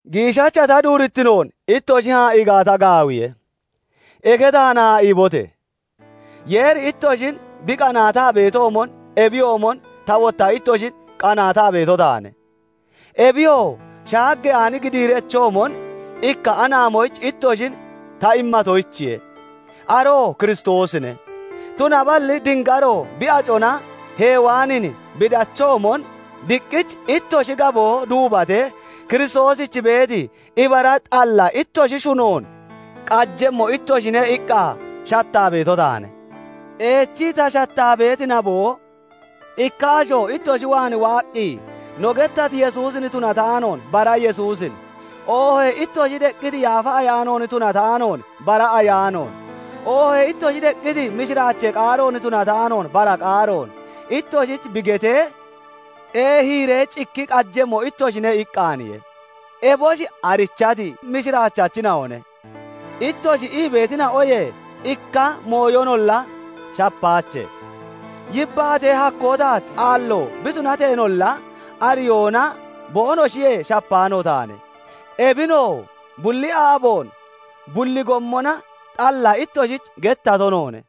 Giishacha ta duurittinoon ittoshi haa'ii gaata gaawiye; eke taan haa'iibote! Yeeri ittoshin bi qanaataa beetoomon, ebiyoomon ta wotta ittoshin qanaataa beeto taane; ebiyoo shaaggeyaani gidiirechoomon ikka anaamoyich ittoshin ta immatoyichiye; aroo Kiristoosine; tunaballi dingaro bi acona Hewaanin bi dachoomon, diqqich ittoshi gaboo duubatee Kiristoosich beeti ibara xalla ittoshi shunoon qajemmo ittoshine iqqa shattaa beeto taane. Eechii ta shattaa beeti naboo, ikka asho ittoshi waan waaqqi no gettati Yesuusin tunataanoon bara Yesuusin, oohee ittoshi deqqiti Yaafa Ayaanoon tunataanoon bara ayaanoon, oohee ittoshi deqqiti mishiraachee qaaroon tunataanoon bara qaaroon ittoshich bi getee, eehiiree cikki qajemmo ittoshine iqqaaniye. Eboshi "Arichati mishiraachachina'one" ittoshi ii beetina'oyee ikka mooyonolla shappaache. Yibbaatee hakkoo taach aallo bi tunateenolla, ariyoona boonoshiyee shapaano taane; ebinoo bulli aaboon bulli gommona xalla ittoshich gettato noone.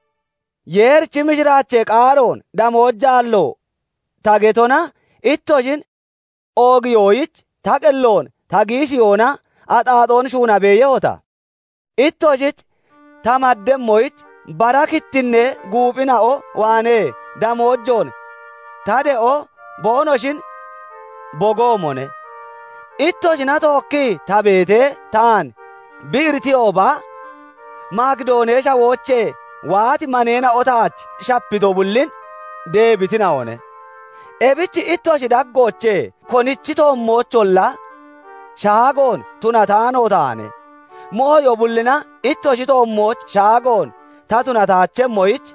Yeerichi mishiraachee qaaroon damoojaallo ta getona, ittoshin oogiyoyich ta qelloon ta giishiyoona axaaxoon shuuna beeyehota? Ittoshich ta maddemmoyich bara kittinnee guuphina'o waanee damoojoon ta de'o boonoshin bogoomone; ittoshina tookkii ta beetee taan bi iritiyooba, Makidoonee Shawoochee waati maneena'o taach shapito bullin deebitina'one; ebich ittoshi daggoochee konichi toommoocholla shaagoon tunataano taane; mooyo bullina ittoshi toommooch shaagoon ta tunataachemmoyich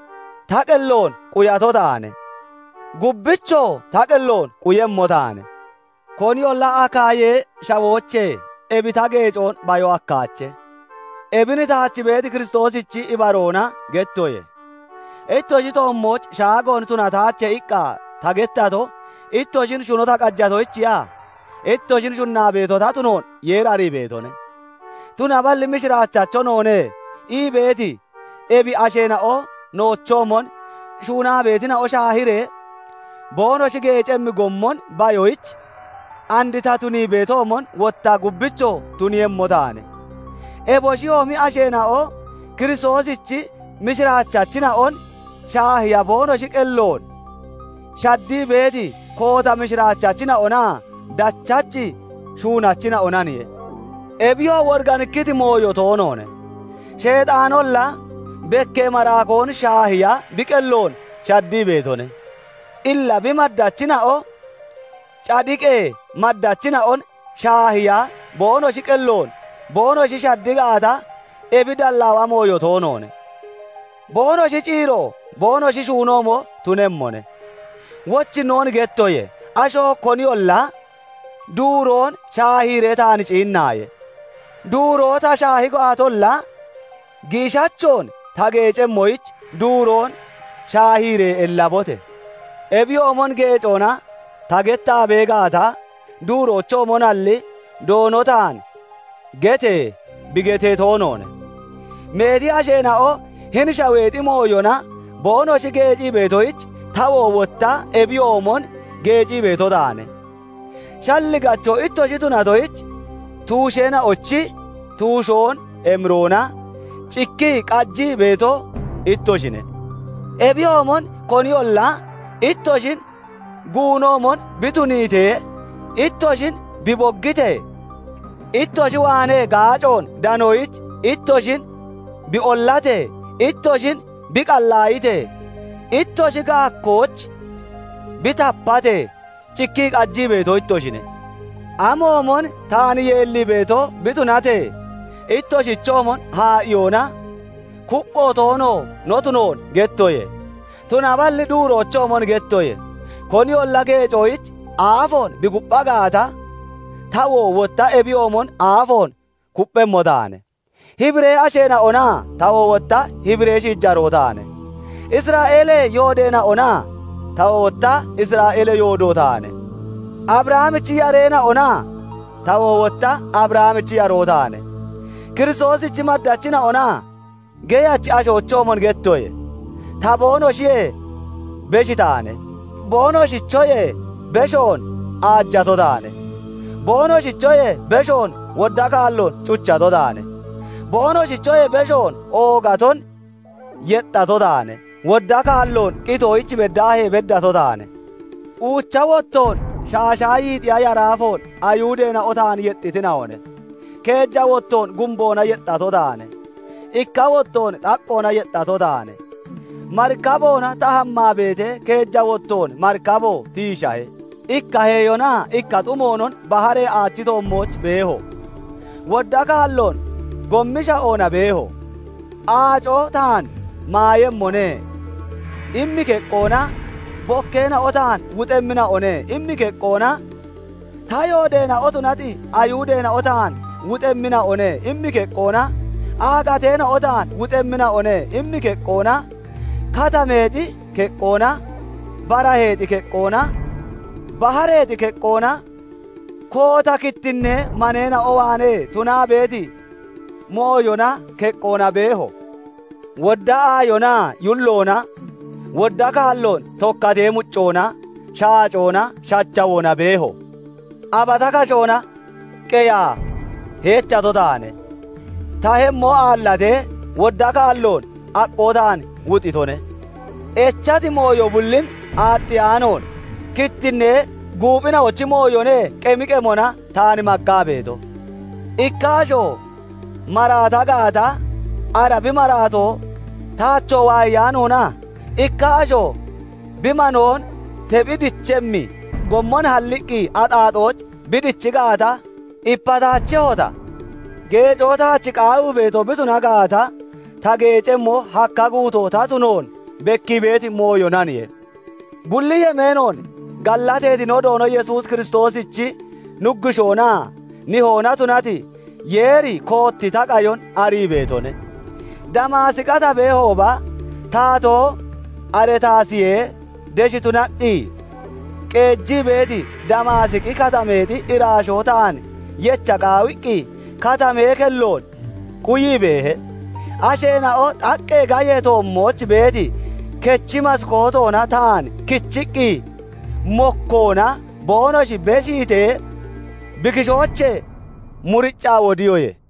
ta qelloon quyato taane; gubbichoo ta qelloon quyemmo taane. Koniyolla Akaayee Shawoochee ebi ta geecoon bayon hakkaache; ebin taach beeti Kiristoosichi ibaroona gettoye. Ittoshi toommooch shaagoon tunataache iqqa ta gettato, ittoshin shuno ta qajatoyichiya? Ittoshin shunnaa beeto ta tunoon Yeeri arii beetone. Tunaballi "Mishiraachacho noone" ii beeti ebi asheena'o noochoomon shuunaa beetina'o shaahiiree boonoshi geecemmi gommon bayoyich, and ta tunii beetoomon wotta gubbichoo tuniiyemmo taane. Eboshiyoomi asheena'o Kiristoosichi mishiraachachina'on shaahiya boonoshi qelloon shaddii beeti koota mishiraachachina'onaa dachachi shuunachina'onaniye. Ebiyoo woriganikkiti mooyo toonoone; Sheexaanolla bekkee maraakoon shaahiya bi qelloon shaddii beetone. Illa bi maddachina'o cadiqee maddachina'on shaahiya boonoshi qelloon boonoshi shaddi gaata, ebi dallaawa mooyo toonoone; boonoshi ciiro boonoshi shuunoomo tunemmone. Wochinnoon gettoye; asho koniyolla duuroon shaahiiree taan ciinnaaye; duuroo ta shaahi gaatolla, giishachoon ta geecemmoyich duuroon shaahiiree ellabote! Ebiyoomon geecoona ta gettaa bee gaata, duuroochoomonalli, Doono taan "Gete!" bi getee toonoone. Meeti asheena'o hini shaweexi mooyona boonoshi geecii beetoyich, tawoo wotta ebiyoomon geecii beeto taane. Shalligacho ittoshi tunatoyich, tuusheena'ochi tuushoon emiroona cikkii qajii beeto ittoshine. Ebiyoomon koniyolla ittoshin guunoomon bi tuniitee, ittoshin bi boggitee, ittoshi waanee gaacoon danoyich ittoshin bi ollatee, ittoshin bi qallaayitee, ittoshi gaakkooch bi tapatee, cikkii qajii beeto ittoshine. Amoomon taan yeellii beeto bi tunatee, ittoshichoomon haa'iyoona kuppho toono no tunoon gettoye. Tunaballi duuroochoomon gettoye; koniyolla geecoyich aafoon bi kuppha gaata, tawoo wotta ebiyoomon aafoon kupphemmo taane; Hibiree shiijareena'ona? Tawoo wotta Hibiree shiijaroo taane. Isra'eelee yoodeena'ona? Tawoo wotta Isra'eelee yoodo taane. Abrahamichi yareena'ona? Tawoo wotta Abrahamichi yaroo taane. Kiristoosichi maddachina'ona? Geyachi ashoochoomon gettoye; ta boonoshiyee besh taane; boonoshichoyee beshoon aajato taane; boonoshichoyee beshoon wodda kaalloon cuchato taane; boonoshichoyee beshoon oogaton yexxato taane; wodda kaalloon qitoyich beddaahee beddato taane; uucha wottoon shaashaa yiixiya yaraafoon Ayihudeena'o taan yexxitina'one; keeja wottoon gumboona yexxato taane; ikka wottoon xaqqoona yexxato taane; marikaboona ta hammaa beetee, keeja wottoon marikabo tiishahe; ikka heeyonaa ikka xumoonon baharee aachi toommooch beeho; wodda kaalloon gommi sha'oona beeho; "Aaco taan maayemmone" immi keqqoona, "Bokkeena'o taan wuxemmina'one" immi keqqoona, "Ta yoodeena'o tunati Ayihudeena'o taan wuxemmina'one" immi keqqoona, "Aagateena'o taan wuxemmina'one" immi keqqoona, katameexi keqqoona, baraheexi keqqoona, bahareexi keqqoona, koota kittinnee maneena'o waanee tunaa beeti mooyona keqqoona beeho; wodda aayoonaa yulloona, wodda kaalloon tokkatee muccoona, shaacoona, shachawoona beeho; abata kashoona qeyaa heechato taane; ta tahemmo aallatee wodda kaalloon aqqoo taan wuxitone. Echati mooyo bullin aaxxiyaanoon, kittinnee guuphina'ochi mooyone qemi qemona taan maggaa beeto. Ikka asho maraata gaata, ara bi maraato taachoo waayeyaanoona? Ikka asho bi manoon tephi dichemmi gommon halliqqi axaaxooch bi dichi gaata, ipataachehota? Geecoo taach qaawii beeto bi tuna gaata, ta geecemmo hakka guutoo ta tunoon bekkii beeti mooyonaniye. Bulli yemeenoon gallateeti no Doono Yesuus Kiristoosichi Nuggushoonaa Nihoona tunati Yeeri kootti ta qayon arii beetone. Damaasiqa ta beehooba, taatoo Aretaasiyee desh tunaqqi qeejii beeti Damaasiqi Katameexi iraashoo taan yecha qaawiqqi katamee kelloon quyii beehe; asheena'o xaqqee gayee toommooch beeti kechi maskootoona taan kichiqqi mokkoona boonoshi kindiitee, bi kishoochee muriccaa wodiyoye.